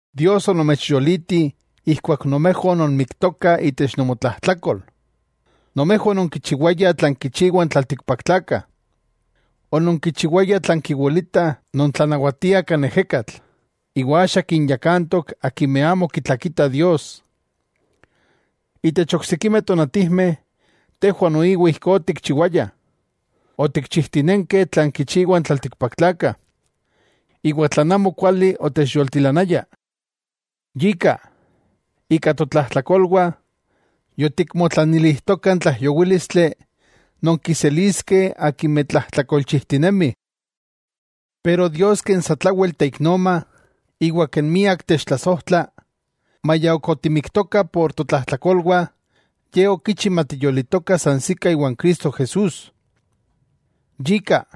Dios onomechyoliti ijkuak nomejwah ononmiktokah itech nomotlajtlakol. Nomejwah ononkichiwayah tlan kichiwah n tlaltikpaktlakah. Ononkichiwayah tlan kiwilita non tlanawatia kan ejekatl, iwa axa kinyakantok akimeh amo kitlakitah Dios. Itech oksikimeh tonatijmeh tejwah noiwa ijkó otikchiwayah. Otikchijtinenkeh tlan kichiwah n tlaltikpaktlakah, iwa tlan amo kuali otechyoltilanaya. Yika, ika totlajtlakolwah yotikmotlanilijtokah n tlaijyowílistli non kiseliskeh akimeh tlajtlakolchijtinemih. Pero Dios ken satlawel teiknoma, iwa ken miak techtlasojtla, maya ok otimiktokah por totlajtlakolwah, Ye okichi matiyolitokah sansikah iwan Cristo Jesús. Yika,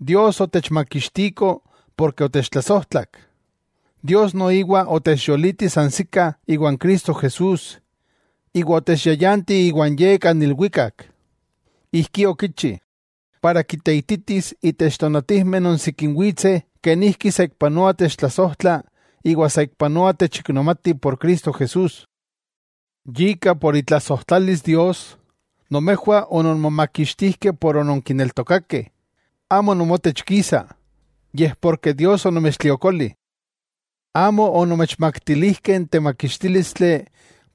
Dios otechmakixtiko porke otechtlasojtlak. Dios noiwa otechyoliti sansikah iwan Cristo Jesús, iwa otechyayanti iwan Ye, kan ilwikak. Ijkí okichi, para kiteititis itech tonatijmeh non sikin witseh kenijki saikpanoa techtlasojtla iwa saikpanoa techiknomati por Cristo Jesús. Yika por itlasojtlalis Dios, nomejwah ononmomakixtijkeh por ononkinetokakeh, amo nomotech kisa, yej porke Dios onomechtliokoli. Amo onomechmaktilijkeh n temakixtílistli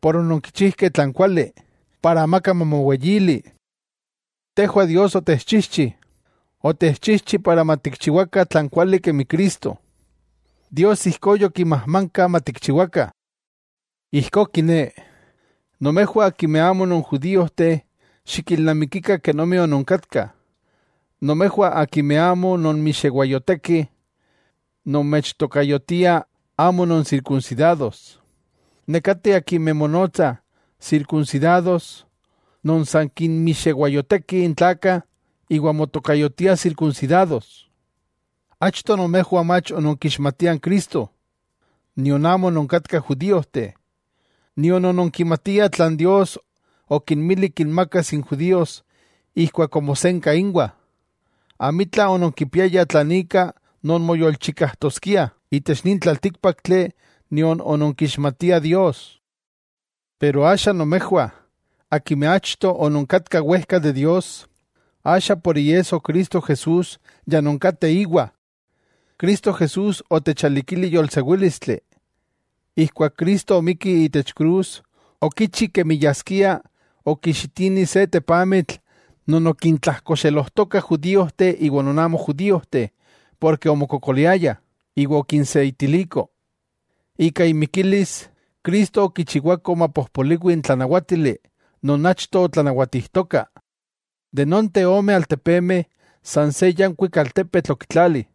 por ononkichijkeh tlan kuali, para amaka mamoweyili. Tejwah Dios otexchijchi, otexchijchi para matikchiwakah tlan kuali kemi Cristo, Dios ijkó yokimajmanka matikchiwakah. Ijkó kiné, nomejwah akimeh amo non judíojteh xikilnamikikah kenomi ononkatkah. Nomejwah akimeh amo nonmixewayotekih, nomechtokayotiah amo non “sirkunsidados” nekateh akimeh monotsah “sirkunsidados” non san kinmixewayotekih n tlakah, iwa motokayotiah sirkunsidados. Achto nomejwah mach ononkixmatiah n Cristo, nion amo ononkatkah judíojteh, nion ononkimatiah tlan Dios okinmili kinmakas n judíos ijkuak omosenka inwah. Amitla ononkipiayah tlan ika nonmoyolchikajtoskiah itech nin tlaltíkpaktli nion ononkixmatiah Dios. Pero axa nomejwah akimeh achto ononkatkah wejka de Dios, axa por iesso Cristo Jesús ya nonkateh íwa. Cristo Jesús otechalikili yolsewílistli: Ijkuak Cristo omikki itech krus okichi kemi yaskia okixitini se tepamitl non okintlajkoxelojtokah judíojteh iwa non amo judíojteh porke omokokoliaya, iwa okinseitiliko. Ika imikilis, Cristo okichiwako mapojpoliwi n tlanawátili non achto otlanawatijtoka. De nonteh ome altepemeh san se yankuik altepetl okitlali,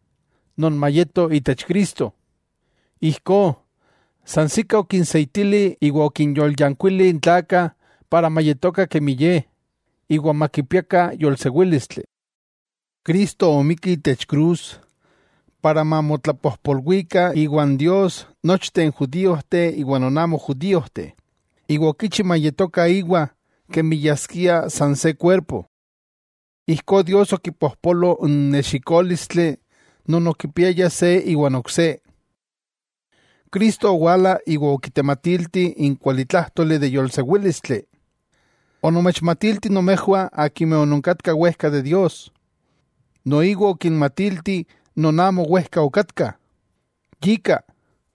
non mayeto itech Cristo. Ijkó sansikah okinseitili iwa okinyolyankuili n tlakah para mayetokah kemi Ye, iwa makipiakah yolsewílistli. Cristo omikki itech krus para mamotlapojpolwikah iwan Dios nochteh n judíojteh iwa non amo judíojteh, iwa okichi mayetokah íwa kemi yaskia san se kuerpo. Ijkó Dios okipojpolo n nexikólistli non okipiaya se iwan ok se. Cristo owala iwa okitematilti n kualitlájtoli de yolsewílistli. Onomechmatilti nomejwah akimeh ononkatkah wejka de Dios, noiwa okinmatilti non amo wejka okatkah. Yika,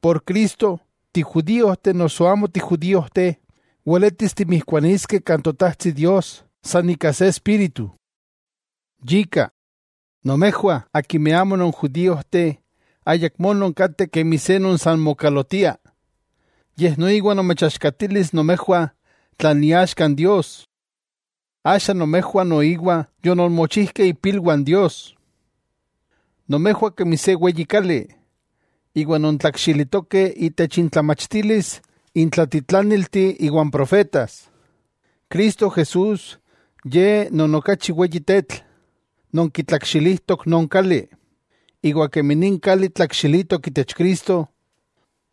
por Cristo, tijudíojteh noso amo tijudíojteh weletis timijkuaniskeh kan Totajtsi Dios san ika se Espíritu. Yika, nomejwah akimeh amo non judiojteh ayakmó nonkateh kemi se non san mokalotiah, yej noiwa nomechaxkatilis nomejwah tlan iaxka n Dios. Axa nomejwah noiwa yononmochijkeh ipilwah n Dios. Nomejwah kemi se weyi kali, iwa nontlakxilitokeh itech intlamachtilis n tlatitlánilti iwa n profetas. Cristo Jesús, Ye non okachi weyi tetl, non kitlakxilijtok non kali. Iwa kemi nin kali tlakxilitok itech Cristo,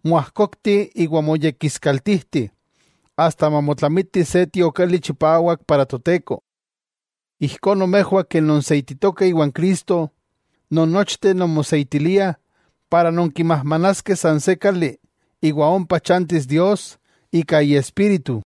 moajkokti iwa moyekiskaltijti asta mamotlamiti se tiokali chipawak para Toteko. Ijkó nomejwah ken nonseititokeh iwan Cristo, nonnochteh nonmoseitiliah para nonkimajmanaskeh san se kali iwa ompa chantis Dios ika Iespíritu.